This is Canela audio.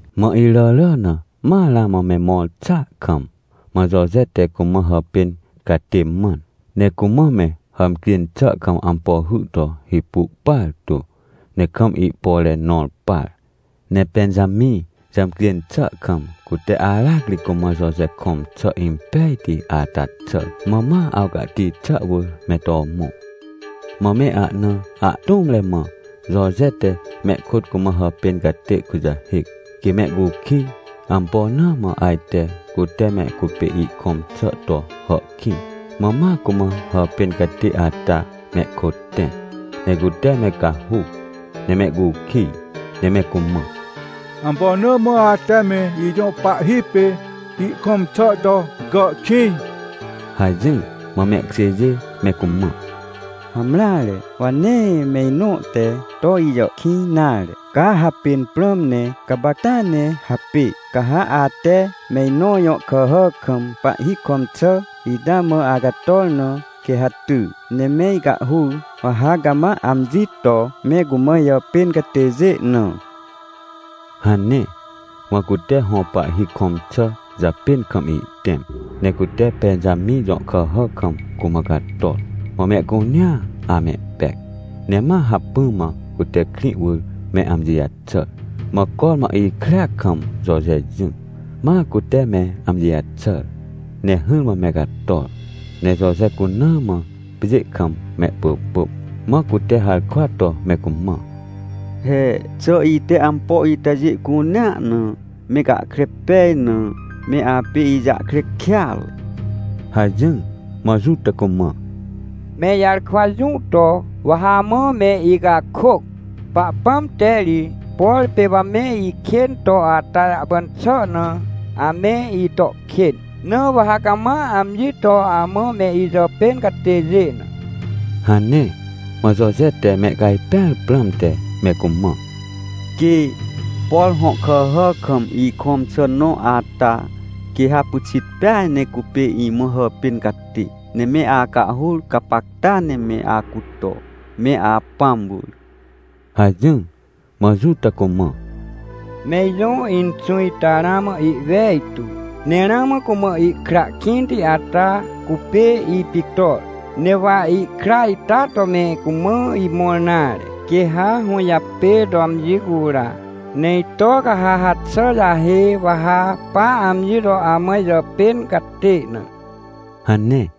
Mã iràrà na ma ramã me mõr xàa kam, mã Joje te cumã hàpên catê mãn, ne cumã me hàmcjên xà kam ampo hy to hipu partu, ne kam ihpore nõr par. Ne Pẽnjamĩ jàmcjên xà kam, cute aracri cumã Joje kõm xà impejti ata xàr. Mã ma awcahti xà wỳr me to mõ. Mã me ahna ahtũmre mã Joje te mehkôt cumã hàpên catê kujahêc, quê mehcukij, ampo na mã ajte cute me cupê ihkõm xà to hàhkĩj. Mã ma cumã hàpên catê ata mehkôt tẽ, ne cute me cahuc, ne mehcukij, ne me cumã: — Ampo na mã ate me ijõ pahhi pê ihkõm xà to gàhkĩj? — hajỹr. Mã mehkjêjê me cumã: — Hamreare, wa nee me inõ te to ijàhkĩj nare. Ca hapên prãm ne gapacta ne hapê. Ca ha ate me inõ jõ kàhà kam pahhi kõm xà ita mã acator na, quê ha ty, ne me icahhur, wa ha cama amji to me cumã ijàpên catêjê na — hane. Mã cute hõ pahhi kõm xà japên kam ihtẽm, ne cute Pẽnjamĩ jõ kàhà kam cumã cator. Mã mehcunea amehpec, ne ma hacpỹ mã cute krĩ wỳr me amji jaxàr. Mã cormã ikrea kam Joje jỹ, mã cute me amji jaxàr ne hỹrmã me cator, ne Joje cuna mã pjê kam mehpỳpỳm. Mã cute harkwa to me cumã: — He, xà ite ampo itajê cunea na me gahkre pej na, me apê ijahkre kêatre? — hajỹr. Mã Juta cumã: — Me ijarkwa jũ to, wa ha amã me icakôc? Pahpãm te ri, por pê wa me ikên to ata jahpan xà na, ame ito kên. Na wa ha cama amji to amã me ijàpên catêjê na — hane. Mã Joje te me cajpẽar prãmte me cumã: — Quê! Por hõ kàhà kam ikõm xà nõ ata, quê ha pyxit peaj ne cupê imã hàpên catê, ne me acahhur gapacta ne me acuto, me apãm wỳr — hajỹr. Mã Juta cumã: — Me ijõ inxũ ita ramã ihwejtu, ne ramã cumã ihkra kĩnti ata cupê ipictor, ne wa ihkra ita to me cumã imõr nare, quê ha hũjapê to amji cura. Ne ito ca ha haxà jahê, wa ha pa amji to amã ijàpên catê na — hane.